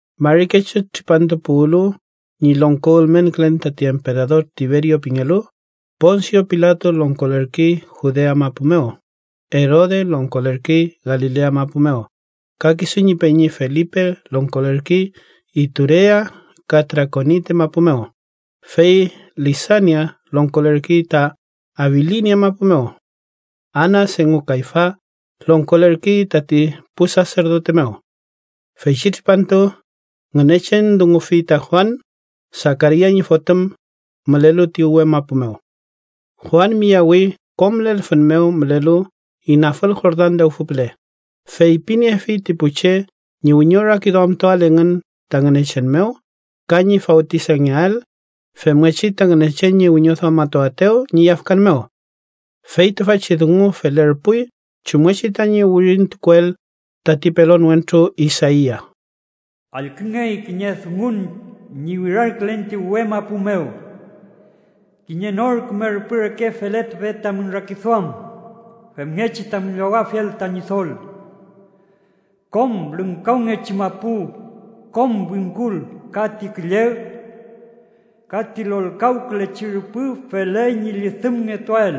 Mari kechu tripantu puwlu ñi longko ülmenkülen tati emperador Tiberio pingelu, Ponsio Pilato longkolerkey Judea mapu mew, Erode longkolerkey Galilea mapu mew, ka kisu ñi peñi Felipe longkolerkey Iturea ka Trakonite mapu mew, fey Lisania longkolerkey ta Abilinia mapu mew. Anas engu Kayfas longkolerkey tati pu saserdote mew. Feychi tripantu, Ngünechen dungufi ta Juan, Sakaria ñi fotüm, mülelu ti uwe mapu mew. Juan miyawi kom lelfün mew mülelu inafül Jordan lewfü püle, feypiniefi ti pu che ñi wiñorakiduamtuael engün ta Ngünechen mew ka ñi fawtisangeael, femngechi ta Ngünechen ñi wiñoduamatuaetew ñi yafkan mew. Fey tüfachi dungu felerpuy chumngechi tañi wirintukuel tati pelon wentru Isaia: “Allküngey kiñe dungun ñi wirarkülen ti uwe mapu mew: ‘Kiñe nor küme rüpü reke feletupe tamün rakiduam, femngechi tamün llowafiel ta Ñidol. Kom lüngkawngechi mapu, kom wingkul ka ti külleg ka ti lolkawkülechi rüpü feley ñi llüdümngetuael,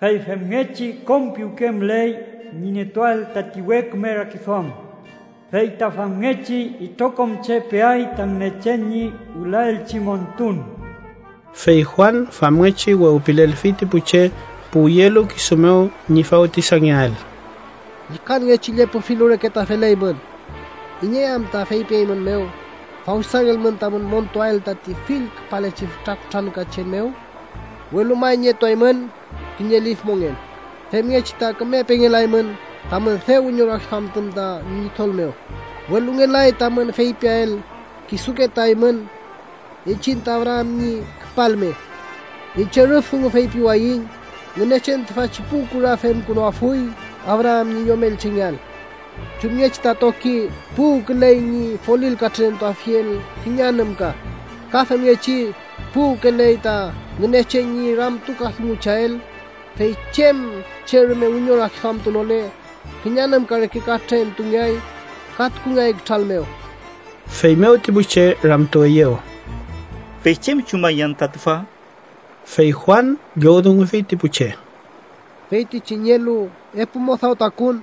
fey femngechi kom piwke müley ñi nietuael tati we küme rakiduam. Fey ta famngechi itrokom che peay ta Ngünechen ñi wülaelchi montun.’” Fey Juan famngechi wewpilelfi ti pu che puwyelu kisu mew ñi fawtisangeael: “¡Llükangechi llepü filu reke ta feleymün! ¿Iney anta feypieymünmew fawtisangelmün tamün montuael tati fülkülepachi fütra kutrankachen mew? Welu may nietuaymün kiñe lif mongen femngechi ta küme pengelaymün tamün dew wiñorakiduamtun ta Ñidol mew, welu ngelay tamün feypiael kisuke ta eymün: ‘¡Iñchiñ ta Abraam ñi küpalme!’ Iñche rüf dungu feypiwayiñ Ngünechen tüfachi pu kura femkünuafuy Abraam ñi yomelchengeael. Chumngechi ta toki puwküley ñi folil katrünentuafiel kiñe anümka, ka femngechi puwküley ta Ngünechen ñi ramtukadungucheael, fey chem che rume wiñorakiduamtunole, kiñe anümka reke katrüngeay ka tukungeay kütral mew.” Feymew ti pu che ramtueyew: —¿Fey chem chumaiñ anta tüfa? Fey Juan llowdungufi ti pu che: —Feytichi nielu epu mudaw takuwün,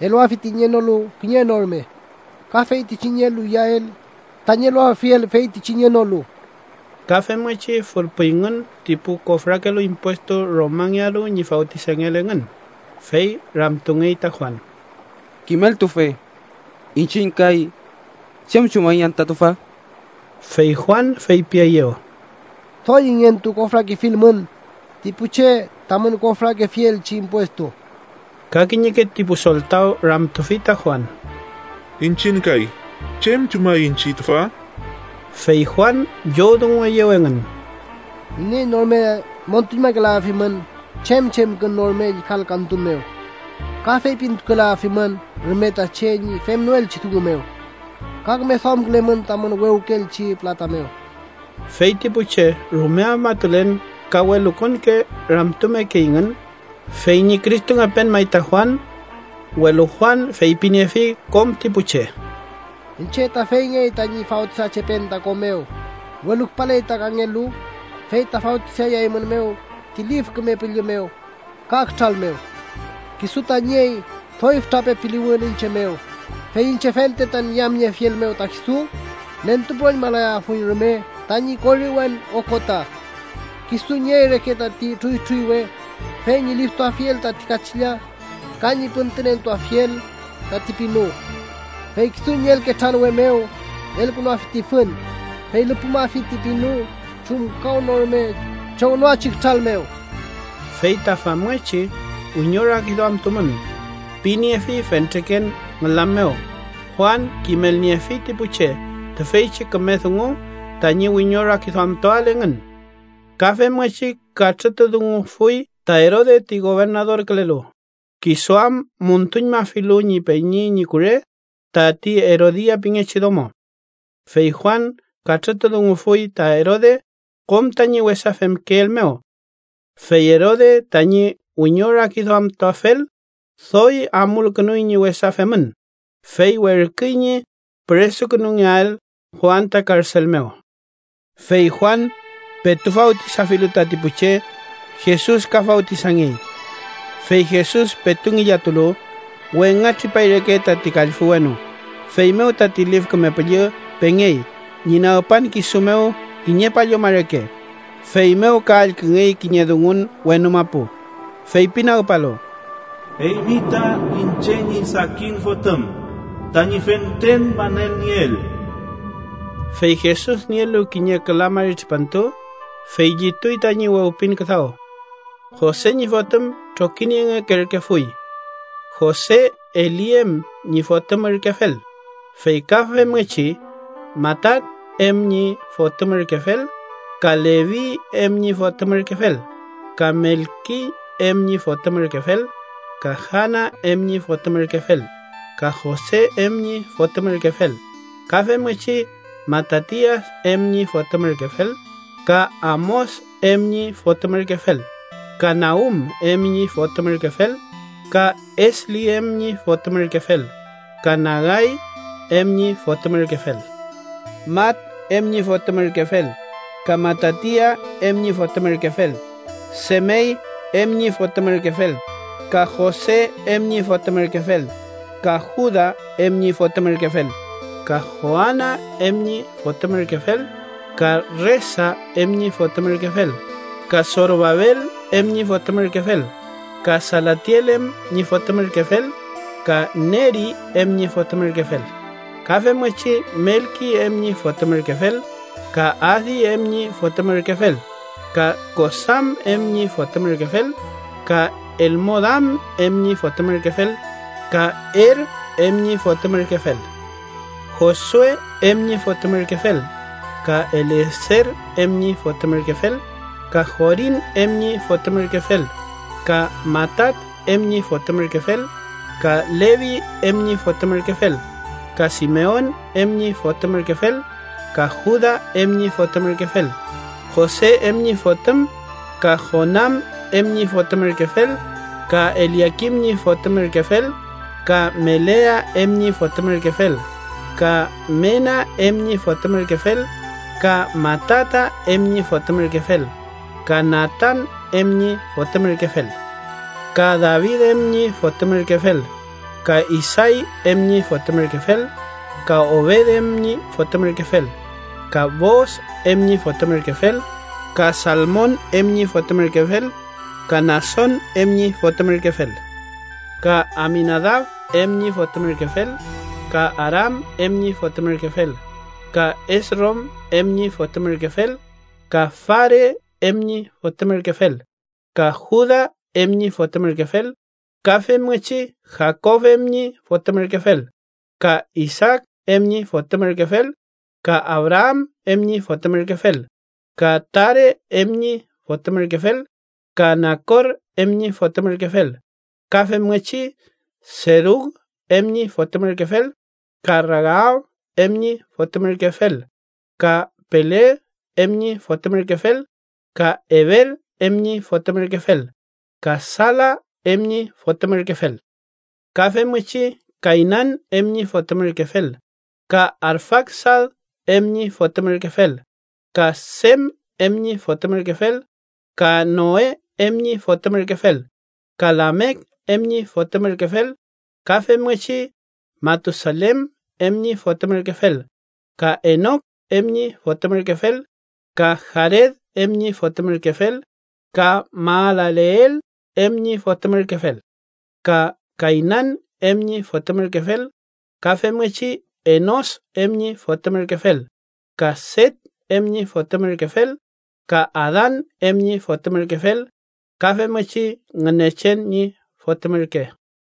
eluafi ti nienolu kiñe no rume. Ka feytichi nielu iyael, tañi eluafiel feytichi nienolu. Ka femngechi fülpayngün ti pu kofrakelu impuestu Romangealu ñi fawtisangeael engün, fey ramtungey ta Juan: —Kimeltufe. ¿Iñchiñ kay, chem chumaiñ anta tüfa? Fey Juan feypieyew: —Doy ingentu kofrakefilmün ti pu che tamün kofrakefielchi impuestu. Ka kiñeke ti pu soltaw ramtufi ta Juan: —Iñchiñ kay, ¿chem chumaiñ chey tüfa? Fey Juan llowdungueyew engün: —Iney no rume müntuñmakelayafimün chem chemkün no rume llükalkatun mew. Ka feypintukukelayafimün rume ta che ñi femnoelchi dungu mew. Ka küme duamkülemün tamün wewkeelchi pülata mew. Fey ti pu che rume afmatulen ka welukonke ramtumekeyngün, fey ñi Cristongepen may ta Juan, welu Juan feypiniefi kom ti pu che: “Iñche ta feyngey tañi fawtisachepen ta ko mew, welu küpaley ta kangelu, fey ta fawtisayaeymünmew ti Lif Küme Püllü mew ka kütral mew. Kisu ta niey doy fütra pepiluwün iñche mew, fey iñche fente tañi yamniefiel mew ta kisu, nentupüroñmalayafuiñ rume tañi koriwen okota. Kisu nüniey reke tati trüytrüywe, fey ñi liftuafiel tati kachilla ka ñi püntünentuafiel tati pinu. Fey kisu ñi elketranwe mew elkünuafi ti fün, fey lüpümafi ti pinu chumkawnorume chongnoachi kütral mew.” Fey ta famngechi wiñorakiduamtumün piniefi fentreken ngülam mew, Juan kimelniefi ti pu che tüfeychi küme dungu tañi wiñorakiduamtuael engün. Ka femngechi katrütudungufuy ta Erode ti gobernadorkülelu, kisu am müntuñmafilu ñi peñi ñi kure, tati Erodia pingechi domo. Fey Juan katrütudungufuy ta Erode kom tañi wesa femkeel mew. Fey Erode tañi wiñorakiduamtuafel, doy amulkünuy ñi wesa femün, fey werküy ñi püresukünungeael Juan ta karsel mew. Fey Juan, petu fawtisafilu tati pu che, Jesus ka fawtisangey. Fey Jesus petu ngillatulu, wengatripay reke tati kallfü wenu. Feymew tati Lif Küme Püllü pengey ñi nagpan kisu mew kiñe palluma reke, feymew ka allküngey kiñe dungun wenu mapu, feypinagpalu: “Eymi ta iñche ñi sakin Fotüm, tañi fentren manelnieel.” Fey Jesus nielu kiñe küla mari tripantu, fey llituy tañi wewpin küdaw. Jose ñi fotüm trokiniengekerkefuy. Jose Eli em ñi fotüm ürkefel, fey ka femngechi Matat em ñi fotüm ürkefel, ka Levi em ñi fotüm ürkefel, ka Melki em ñi fotüm ürkefel, ka Jana em ñi fotüm ürkefel, ka Jose em ñi fotüm ürkefel, ka femngechi Matatias em ñi fotüm ürkefel, ka Amos em ñi fotüm ürkefel, ka Naum em ñi fotüm ürkefel, ka Esli em ñi fotüm ürkefel, ka Nagay em ñi fotüm ürkefel, Mat em ñi fotüm ürkefel, ka Matatias em ñi fotüm ürkefel, Semey em ñi fotüm ürkefel, ka Jose em ñi fotüm ürkefel, ka Juda em ñi fotüm ürkefel, ka Joana em ñi fotüm ürkefel, ka Resa em ñi fotüm ürkefel, ka Sorobabel em ñi fotüm ürkefel, ka Salatiel em ñi fotüm ürkefel, ka Neri em ñi fotüm ürkefel, ka femngechi Melki em ñi fotüm ürkefel, ka Adi em ñi fotüm ürkefel, ka Kosam em ñi fotüm ürkefel, ka Elmodam em ñi fotüm ürkefel, ka Er em ñi fotüm ürkefel, Josue em ñi fotüm ürkefel, ka Elieser em ñi fotüm ürkefel, ka Jorim em ñi fotüm ürkefel, ka Matat em ñi fotüm ürkefel, ka Levi em ñi fotüm ürkefel, ka Simeon em ñi fotüm ürkefel, ka Juda em ñi fotüm ürkefel, Jose em ñi fotüm, ka Jonam em ñi fotüm ürkefel, ka Eliakim ñi fotüm ürkefel, ka Melea em ñi fotüm ürkefel, ka Mena em ñi fotüm ürkefel, ka Matata em ñi fotüm ürkefel, ka Natan em ñi fotüm ürkefel, ka David em ñi fotüm ürkefel, ka Isay em ñi fotüm ürkefel, ka Obed em ñi fotüm ürkefel, ka Boos em ñi fotüm ürkefel, ka Salmon em ñi fotüm ürkefel, ka Nason em ñi fotüm ürkefel, ka Aminadab em ñi fotüm ürkefel, ka Aram em ñi fotüm ürkefel, ka Esrom em ñi fotüm ürkefel, ka Fares em ñi fotüm ürkefel, ka Juda em ñi fotüm ürkefel, ka femngechi Jakob em ñi fotüm ürkefel, ka Isaak em ñi fotüm ürkefel, ka Abraam em ñi fotüm ürkefel, ka Tare em ñi fotüm ürkefel, ka Nakor em ñi fotüm ürkefel, ka femngechi Serug em ñi fotüm ürkefel, ka Ragaw em ñi fotüm ürkefel, ka Peleg em ñi fotüm ürkefel, ka Eber em ñi fotüm ürkefel, ka Sala em ñi fotüm ürkefel, ka femngechi Kaynan em ñi fotüm ürkefel, ka Arfaksad em ñi fotüm ürkefel, ka Sem em ñi fotüm ürkefel, ka Noe em ñi fotüm ürkefel, ka Lamek em ñi fotüm ürkefel, ka femngechi Matusalen em ñi fotüm ürkefel, ka Enok em ñi fotüm ürkefel, ka Jared em ñi fotüm ürkefel, ka Mahalaleel em ñi fotüm ürkefel, ka Kaynan em ñi fotüm ürkefel, ka femngechi Enos em ñi fotüm ürkefel, ka Set em ñi fotüm ürkefel, ka Adan em ñi fotüm ürkefel, ka femngechi Ngünechen ñi Fotüm ürke.